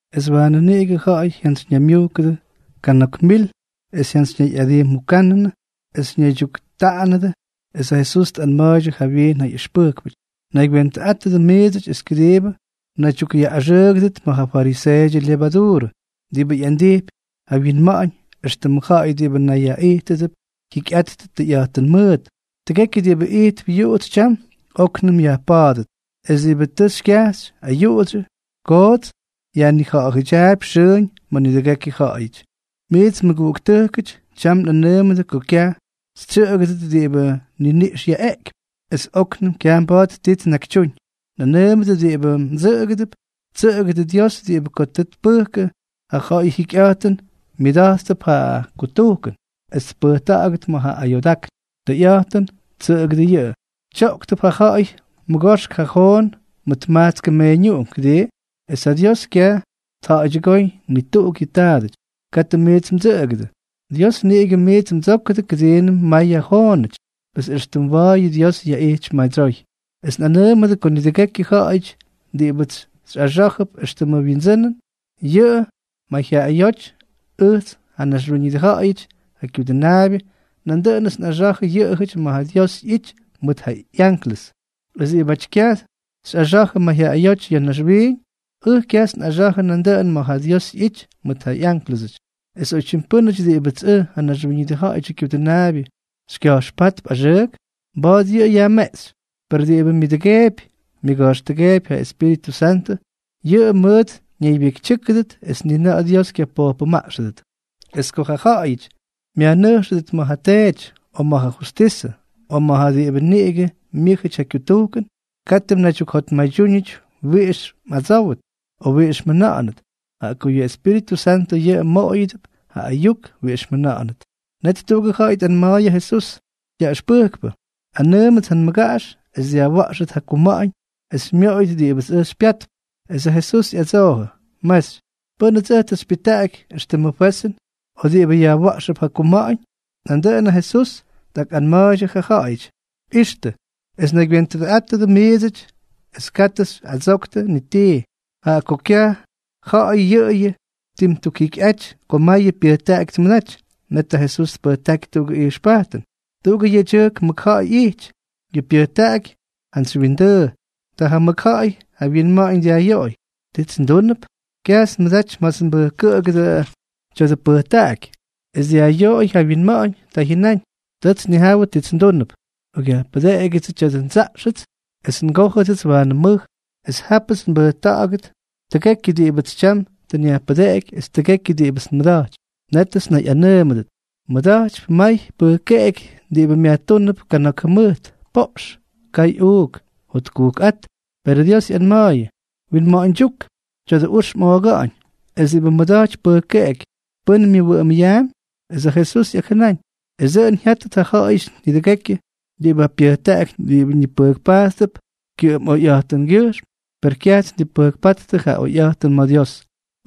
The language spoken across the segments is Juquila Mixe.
Es waanʉ niꞌigʉ ja̱ꞌa̱y jyantsyñaymyujkʉdʉ kana̱k mil es jyantsyñayꞌadijmujkʉnʉdʉ es ñaydyuktaꞌanʉnʉdʉ. Es ja Jesús tꞌanma̱a̱y jawyiin ja ꞌyʉxpʉjkpʉty: —Naygywentʉꞌátʉdʉ miidsʉty es kʉdiibʉ mnaydyukꞌyaꞌꞌaxʉʉgʉdʉt mʉt ja fariseeʉdyʉ lyevaduurʉ, diꞌibʉ ꞌyandijpy ja wyinma̱ꞌa̱ñ éxtʉmʉ ja̱ꞌa̱y diꞌibʉ nayꞌandíjʉdʉp jyikyꞌattʉ tʉyꞌa̱jtʉn mʉʉt. Tʉgekyʉ diꞌibʉ ijtp yuꞌutsy tyam, óknʉm yajpa̱a̱dʉt. Es diꞌibʉ tʉ xykyajxy ayuꞌudsyʉ koots, yajnija̱ꞌa̱dyaapy xʉʉñ ma̱ nidʉgekyʉ ja̱ꞌa̱yʉty. ’Miits mʉguꞌuktʉjkʉty, tyam nꞌanʉʉmʉdʉ ko kyaj xytsyʉꞌʉgʉdʉt diꞌibʉ niniꞌx yaꞌeꞌkypy es óknʉm kyaj mba̱a̱t ti tnakytyúñ. Nꞌanʉʉmʉdʉ diꞌibʉ mdsʉꞌʉgʉdʉp: tsʉꞌʉgʉdʉ Dios diꞌibʉ ko tʉ tpʉjkʉ ja ja̱ꞌa̱yʉ jyikyꞌa̱jtʉn, myʉda̱jtp ja kutujkʉn es pyʉjta̱ꞌa̱gʉt ma̱ ja ayoodákn. Tʉyꞌa̱jtʉn, tsʉꞌʉgʉdʉ yʉꞌʉ. ’Tyoꞌktʉp ja ja̱ꞌa̱y mʉgoxk ja joonuꞌunk mʉt majtskʉ meeñuꞌunk, ¿kʉdii? Es ja Dios kyaj tja̱ꞌa̱ydyʉgóy ni tuꞌuk yʉ taadʉty. Katʉ miits mdsʉꞌʉgʉdʉ. Dios niꞌigʉ miits mdsókʉdʉ kʉdiinʉm mayʉ joonuꞌungʉty. Pes extʉ mwa̱a̱y Dios yaꞌijtypy madsyoy. ’Es nꞌanʉʉmʉdʉ ko nidʉgekyʉ ja̱ꞌa̱yʉty diꞌibʉts xyꞌaxá̱jʉp éxtʉmʉ wyindsʉnʉn ya̱ mayjyaꞌayóty, ʉjts, ja Naxwíñʉdʉ Ja̱ꞌa̱yʉdyʉ Kyudʉnaabyʉ, nandʉꞌʉnʉts nꞌaxa̱jʉ yʉꞌʉjʉty ma̱ ja Dios ꞌyity mʉt ja ꞌyanklʉs. Es diꞌibʉts kyaj xyꞌaxa̱jʉ mayjyaꞌayóty ya̱ naxwiiñ, ʉj kyajts nꞌaxa̱jʉ nandʉꞌʉn ma̱ ja Dios ꞌyity mʉt ja ꞌyánklʉsʉty. Es oytyim pʉ́nʉty diꞌibʉts ʉj, ja Naxwíñʉdʉ Ja̱ꞌa̱yʉdyʉ Kyudʉnaabyʉ, xykya̱jxpátp axʉʉk, mba̱a̱t yʉꞌʉ yajmeꞌxy. Per diꞌibʉ myʉꞌꞌʉdʉgeepy myʉga̱jxtʉgeepy ja Espíritʉ Santʉ, yʉꞌʉ mʉt ñaybyekytyʉ́kʉdʉt es ni na̱ꞌa̱ Dios kyapojpʉmaꞌxʉdʉt. ’Es ko ja ja̱ꞌa̱yʉty myajnʉjxʉdʉt ma̱ ja teedyʉty, o ma̱ ja justísʉty, o ma̱ ja diꞌibʉ niꞌigʉ myʉ́jʉty ja kyutujkʉn, katʉ mnaydyukjotmaydyúñʉty wiꞌix mꞌadsówʉt o wiꞌix mjʉna̱ꞌa̱nʉt, jaꞌa ko yʉ Espíritʉ Santʉ yʉꞌʉ mmoꞌoyʉdʉp ja ayuk wiꞌix mjʉna̱ꞌa̱nʉt. Net tuꞌugʉ ja̱ꞌa̱y tꞌanma̱a̱y ja Jesús: —Yaꞌʉxpʉjkpʉ, anʉʉmʉts ja nmʉgaꞌax es dyajwa̱ꞌxʉt ja kuma̱ꞌa̱ñ esʉts xymyoꞌoyʉt diꞌibʉts ʉj xypyatp. Es ja Jesús ꞌyadsoojʉ: —Mexy, ¿pʉ́nʉts ʉj tʉ xypyʉjtaꞌaky éxtʉmʉ fwezʉn o diꞌibʉ yajwa̱ꞌxʉp ja kuma̱ꞌa̱ñ? Nandʉꞌʉn ja Jesús tꞌakꞌanma̱a̱ydyʉ ja ja̱ꞌa̱yʉty: —Ixtʉ es naygywentʉꞌátʉdʉ miidsʉty es katʉ xyꞌadsoktʉ ni tii, jaꞌa ko kyaj ja̱ꞌa̱y yʉꞌʉyʉ ttimtukjikyꞌaty ko mayʉ pyʉjtaꞌaky tmʉdaty. Net ja Jesús tpʉjtáky tuꞌugʉ ijxpajtʉn: —Tuꞌugʉ yedyʉjk mʉkja̱ꞌa̱y ꞌyijty. Yʉ pyʉjtaꞌaky jantsy wyindʉʉ. Ta ja mʉkja̱ꞌa̱y ja wyinma̱ꞌa̱ñ dyajꞌyoꞌoy: “¿Tits ndúnʉp? Kyajts nmʉdaty ma̱ts nbʉjkʉꞌʉgʉdʉ tya̱dʉ pʉjtaꞌaky.” Es dyajꞌyoꞌoy ja wyinma̱ꞌa̱ñ, ta jyʉnáñ: “Tʉts nnijawʉ tits ndúnʉp. Nꞌokꞌyajpʉdeꞌegyʉdsʉ tya̱dʉ ndsaꞌxʉts es ngójʉdʉts waanʉ mʉj. Es jápʉts nbʉjkʉꞌkta̱ꞌa̱yʉt tʉgekyʉ diꞌibʉts tyam tʉ nyajpʉdeꞌeky es tʉgekyʉ diꞌibʉts nmʉda̱jtypy. Nétʉts nnayꞌanʉʉmʉdʉt: Mmʉda̱jtypy may pʉjkeꞌeky diꞌibʉ myajtúnʉp kana̱k jʉmʉjt. Poꞌx. Kay uuk. Jotkujkꞌát.” Perʉ Dios ꞌyanma̱a̱yʉ: “¡Winma̱ꞌa̱ñdyúk! Tya̱dʉ ux mꞌooga̱ꞌa̱ñ, es diꞌibʉ mmʉda̱jtypy pʉjkeꞌeky, ¿pʉ́n myʉwʉꞌʉmʉp?” Es ja Jesús ꞌyakjʉnáñ: —Es dʉꞌʉn jyátʉt ja ja̱ꞌa̱yʉty nidʉgekyʉ diꞌibʉ pyʉjtaꞌaky ñipʉjkpajttʉp kyʉꞌʉm oyꞌa̱jtʉngyʉjxm, per kyaj tnipʉjkpáttʉ ja oyꞌa̱jtʉn ma̱ Dios.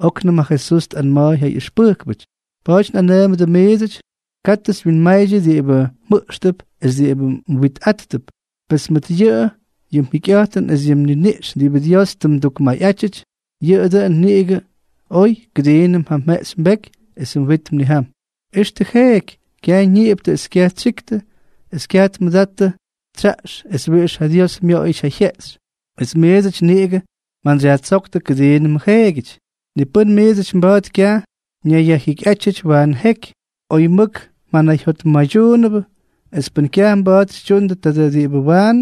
Oknʉm ja Jesús tꞌanma̱a̱y ja ꞌyʉxpʉjkpʉty: —Pa̱a̱ty nꞌanʉʉmʉdʉ miidsʉty, katʉ xywyinmaydyʉ diꞌibʉ mjʉꞌxtʉp es diꞌibʉ mwitꞌáttʉp. Pes mʉt yʉꞌʉyʉ yʉ mjikyꞌa̱jtʉn es yʉ mniniꞌx diꞌibʉ Dios tʉ mdukmayꞌátyʉty, yʉꞌʉ dʉꞌʉn niꞌigʉ oy kʉdiinʉm ja mjeꞌxy mbeky esʉ mwit mnijam. Ixtʉ jeeky. Kyaj ñiꞌiptʉ es kyaj tsyiktʉ es kyaj tmʉdattʉ tsyaꞌx es wiꞌix ja Dios myoꞌoyʉty ja jyeꞌxy. ¡Es miidsʉty niꞌigʉ mjantsyyajtsóktʉ kʉdiinʉmʉ jeegyʉty! Ni pʉ́n miidsʉty mba̱a̱t kyaj ñayyajjikyꞌátyʉty waanʉ jeky, oy mʉk mjanayjyotmaydyuunʉbʉ. Es pʉn kyaj mba̱a̱t xytyundʉ tadʉ diꞌibʉ waanʉ,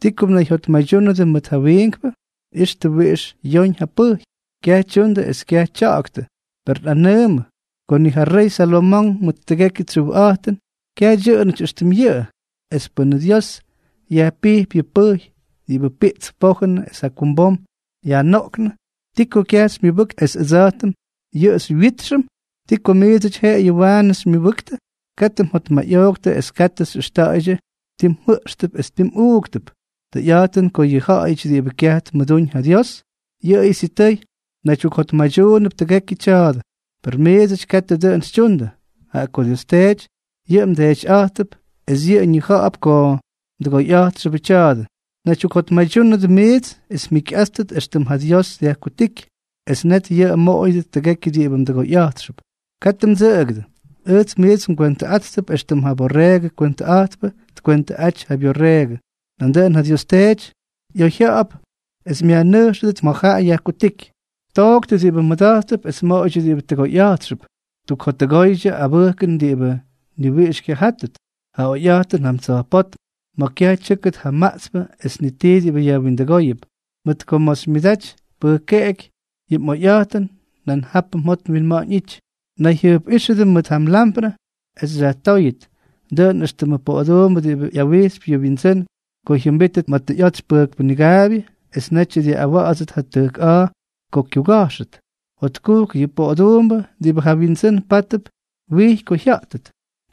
¿ti ko mnayjyotmaydyúnʉdʉ mʉt ja wiinkpʉ? ’Ixtʉ wiꞌix yoñ ja pʉjy. Kyaj tyundʉ es kyaj tya̱ꞌa̱ktʉ. Per nꞌanʉʉmʉ ko ni ja rey Salomonk mʉt tʉgekyʉ tsyujꞌa̱jtʉn, kyaj dyʉꞌʉnʉty éxtʉm yʉꞌʉ. Es pʉnʉ Dios yajpijpy yʉ pʉjy diꞌibʉ piꞌtsp pojʉn es jakumbom yajnoꞌknʉ, ¿ti ko kyaj xymyʉbʉktʉ es ʉdsa̱jtʉm yʉꞌʉ xywyítxʉm? ¿Ti ko miidsʉty jeꞌeyʉ waanʉ xymyʉbʉktʉ? Katʉ mjotmayꞌooktʉ es katʉ xyꞌʉxta̱ꞌa̱ydyʉ ti mjʉꞌxtʉp es ti mꞌuuktʉp. Tʉyꞌa̱jtʉn ko yʉ ja̱ꞌa̱yʉty diꞌibʉ kyaj tmʉdúñ ja Dios, yʉꞌʉyʉ sitʉy naydyukjotmaydyuunʉp tʉgekyʉ tya̱a̱dʉ. Per miidsʉty katʉ dʉꞌʉn xytyundʉ, jaꞌa ko Dios Teety yʉꞌʉ mDeetyꞌa̱jttʉp es yʉꞌʉ ñija̱ꞌa̱p ko mdʉgoyꞌa̱jtxʉbʉ tya̱a̱dʉ. Naydyukjotmaydyúnʉdʉ miidsʉty es mjikyꞌáttʉt éxtʉm ja Dios dyajkutíky, es net yʉꞌʉ mmoꞌoyʉdʉt tʉgekyʉ diꞌibʉ mdʉgoyꞌa̱jtxʉp. ’Katʉ mdsʉꞌʉgʉdʉ. Ʉjts miits ngwentʉꞌáttʉp éxtʉm ja borreegʉ kwentʉꞌa̱jtpʉ tkwentʉꞌaty ja byorreegʉ. Nandʉꞌʉn yʉ Dios Teety ꞌyoyjya̱ꞌa̱p es myajnʉjxʉdʉt ma̱ yʉꞌʉ yajkutíky. ’Tooktʉ diꞌibʉ mmʉda̱jttʉp, es moꞌoydyʉ diꞌibʉ tʉgoyꞌa̱jtxʉp; tukjottʉgoydyʉ abʉjkʉn diꞌibʉ ni wiꞌix kyajátʉt, ja oyꞌa̱jtʉn jam tsa̱jpótm, ma̱ kyaj tyʉ́kʉt ja maꞌtspʉ es ni tii diꞌibʉ yajwindʉgóyʉp. Mʉt ko ma̱ xymyʉdaty pʉjkeꞌeky yʉ mꞌoyꞌa̱jtʉn, nan japʉ mjot mwinma̱ꞌa̱ñ ꞌyity. ’Nayjyʉjpꞌíxʉdʉ mʉt ja mlamprʉ es xyajtóyʉt. Dʉꞌʉn éxtʉmʉ poꞌoduumbʉ diꞌibʉ ꞌyawijxypy yʉ wyindsʉ́n ko jyʉmbítʉt ma̱ tʉ ꞌyotsy pʉjkpʉ nigaabyʉ, es netyʉ dyaꞌꞌawa̱ꞌa̱dsʉt ja tʉjk a̱a̱ ko kyuga̱jxʉt. Jotkujk yʉ poꞌoduumbʉ diꞌibʉ ja wyindsʉ́n pátʉp wijy ko jya̱ꞌtʉt.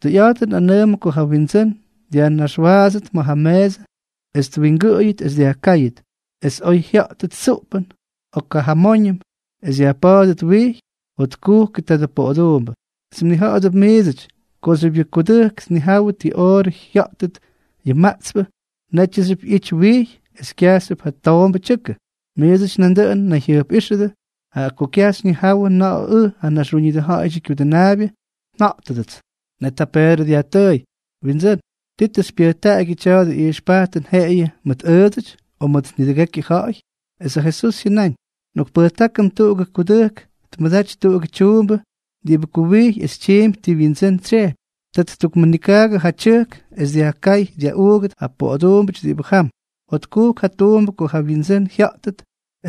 Tʉyꞌa̱jtʉn nꞌanʉʉmʉdʉ ko ja wyindsʉ́n dyajnaxwaadsʉt ma̱ ja meesʉ es twingʉꞌʉyʉt es dyajkáyʉt. Es oy jya̱ꞌtʉt tsuꞌpʉn, o kajamóñʉm es yajpa̱a̱dʉt wijy, jotkujkʉ tadʉ poꞌoduumbʉ. Es mnija̱ꞌa̱dʉp miidsʉty kooxyʉp yʉ kudʉjk tnijawʉ ti oorʉ jya̱ꞌtʉt yʉ maꞌtspʉ, nétxyʉp ꞌyity wijy es kyajxyʉp ja toombʉ tyʉkʉ. Miidsʉty nandʉꞌʉn nayjyʉjpꞌíxʉdʉ, jaꞌa ko kyaj xyñijáwʉdʉ na̱ꞌa̱ ʉj, ja Naxwíñʉdʉ Ja̱ꞌa̱yʉdyʉ Kyudʉnaabyʉ, nja̱ꞌtʉdʉts. Net ja Peedrʉ dyajtʉʉy: —Windsʉ́n, ¿ti tʉ xypyʉjtaꞌagyʉ tya̱dʉ ijxpajtʉn jeꞌeyʉ mʉt ʉʉdsʉty, o mʉt nidʉgekyʉ ja̱ꞌa̱y? Es ja Jesús jyʉnáñ: —Nꞌokpʉjtákʉm tuꞌugʉ kudʉjk tmʉdaty tuꞌugʉ tyuumbʉ diꞌibʉ kuwijy es tyiimpy ti wyindsʉ́n tsyejpy. Ta ttukmʉnikaagʉ ja tyʉjk es dyajkáy dyajꞌuugʉt ja poꞌoduumbʉty diꞌibʉ jam. Jotkujk ja tuumbʉ ko ja wyindsʉ́n jya̱ꞌtʉt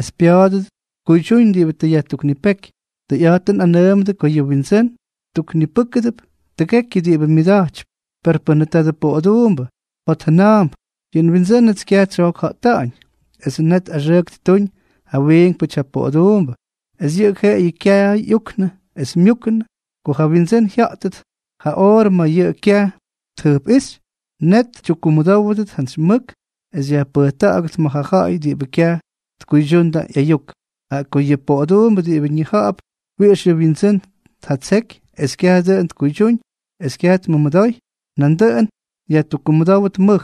es pya̱a̱dʉdʉt tkuydyúñ diꞌibʉ tʉ yajtuknipéky. Tʉyꞌa̱jtʉn nꞌanʉʉmʉdʉ ko yʉ windsʉ́n ttuknipʉ́kʉdʉp tʉgekyʉ diꞌibʉ myʉda̱jtypy. Per pʉnʉ tadʉ poꞌoduumbʉ jotjʉna̱a̱mp: “Yʉ nwindsʉ́nʉts kyaj tsyojkja̱ꞌta̱ꞌa̱ñ”, es net axʉʉk ttuuñ ja wiinkpʉty ja poꞌoduumbʉ, es yʉꞌʉ jeꞌeyʉ kyaay ꞌyuknʉ es myúkʉnʉ. Ko ja wyindsʉ́n jya̱ꞌtʉt ja oorʉ ma̱ yʉꞌʉ kyaj tjʉjpꞌíxy, net tyukkumʉdówʉdʉt jantsy mʉk es yajpʉjta̱ꞌa̱gʉt ma̱ ja ja̱ꞌa̱y diꞌibʉ kyaj tkuydyundʉ ꞌyayuk. ’Jaꞌa ko yʉ poꞌoduumbʉ diꞌibʉ ñija̱ꞌa̱p wiꞌix yʉ wyindsʉ́n tjatseky es kyaj dʉꞌʉn tkuydyúñ es kyaj tmʉmʉdoy, nandʉꞌʉn yajtukkumʉdówʉt mʉj.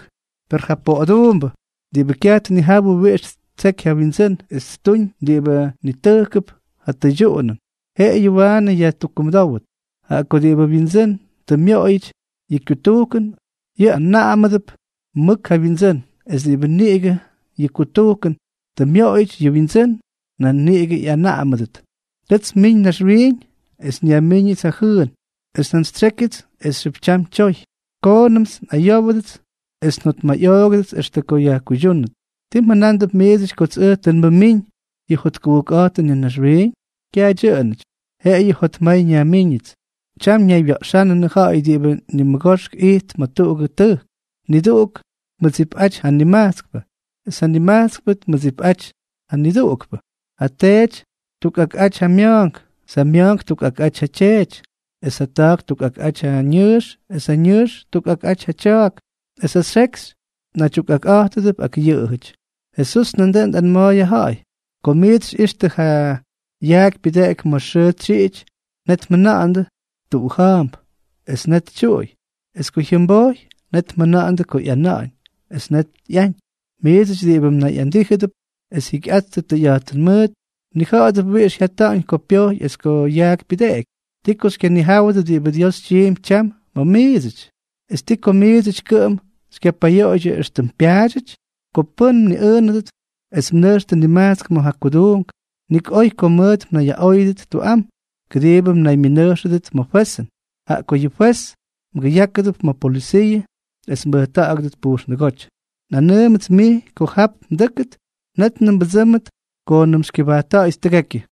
Per ja poꞌoduumbʉ diꞌibʉ kyaj tnijawʉ wiꞌix ttseky ja wyindsʉ́n es ttuñ diꞌibʉ nitʉjkʉp ja tʉydyuꞌunʉn, jeꞌeyʉ waanʉ yajtukkumʉdówʉt. Jaꞌa ko diꞌibʉ wyindsʉ́n tʉ myoꞌoyʉty yʉ kyutujkʉn, yʉꞌʉ anaꞌamʉdʉp mʉk ja wyindsʉ́n, es diꞌibʉ niꞌigʉ yʉ kyutujkʉn tʉ myoꞌoyʉty yʉ wyindsʉ́n, nan niꞌigʉ ꞌyanaꞌamʉdʉt. ’Tʉts nmiñ naxwiiñ es nyajmíñʉts ja jʉʉn. Es njantsytsyékyʉts esxyʉp tyam tyoy. Koonʉmts nꞌayówʉdʉts, es njotmayꞌoogʉdʉts extʉ ko yajkuydyúnʉt. ¿Tii mjʉnándʉp miidsʉty kots ʉj tʉ nmʉmíñ yʉ jotkujkꞌa̱jtʉn ya̱ naxwiiñ? ¡Kyaj dyʉꞌʉnʉty! Jeꞌeyʉ jotmay nyajmiiñʉts. Tyam ñaywya̱ꞌxa̱ꞌa̱nʉdʉ ja̱ꞌa̱y diꞌibʉ nimʉgoxk ijttʉp ma̱ tuꞌugʉ tʉjk. Nidʉgʉʉk tmʉdsipꞌaty ja nimajtskpʉ, es ja nimajtskpʉ tmʉdsipꞌaty nidʉgʉʉkpʉ. Ja teety ttukꞌakꞌaty ja mya̱a̱nk, es ja ma̱a̱nk ttukꞌakꞌaty ja tyeety; es ja ta̱a̱k ttukꞌakꞌaty ja ñʉʉx, es ja nʉʉx ttukꞌakꞌaty ja tya̱a̱k; es ja xekxy naydyukꞌakꞌa̱jtʉdʉp ak jaꞌajʉty. Jesús nandʉꞌʉn tꞌanma̱a̱y ja ja̱ꞌa̱y: —Ko miits xyꞌixtʉ yʉ yaak pyʉdeꞌeky ma̱ xʉʉ tsyiꞌity, net mjʉna̱ꞌa̱ndʉ: “Tuꞌuja̱a̱mp”, es net tyuꞌuy. Es ko jyʉmbojy, net mjʉna̱ꞌa̱ndʉ ko ꞌyana̱ꞌa̱ñ, es net ꞌyañ. Miidsʉty diꞌibʉ nayꞌandíjʉdʉp es jyikyꞌattʉ tʉyꞌa̱jtʉn mʉʉt, mnija̱ꞌa̱dʉp wiꞌix jyata̱ꞌa̱ñ ko pyojy es ko yaak pyʉdeꞌeky, ¿ti ko xykyanijáwʉdʉ diꞌibʉ Dios tyiimpy tyam ma̱ miidsʉty? ¿Es ti ko miidsʉty kʉꞌʉm xykyapayoꞌoydyʉ éxtʉm pyaadyʉty? ’Ko pʉ́n mniꞌʉʉnʉdʉt es mnʉjxtʉ nimajtsk ma̱ ja kuduunk, nik oy ko mʉt mnayyaꞌóyʉdʉt tuꞌam, kʉdiibʉ mnaymyʉnʉjxʉdʉt ma̱ fwezʉn, jaꞌa ko yʉ fwez mgʉyákʉdʉp ma̱ polʉsiiʉ, es mbʉjta̱ꞌa̱gʉdʉt pujxndʉgóty. Nꞌanʉʉmʉts mij, ko jap mdʉ́kʉt, nétnʉm mbʉdsʉ́mʉt koonʉm xykyʉbajtta̱ꞌa̱yʉt tʉgekyʉ.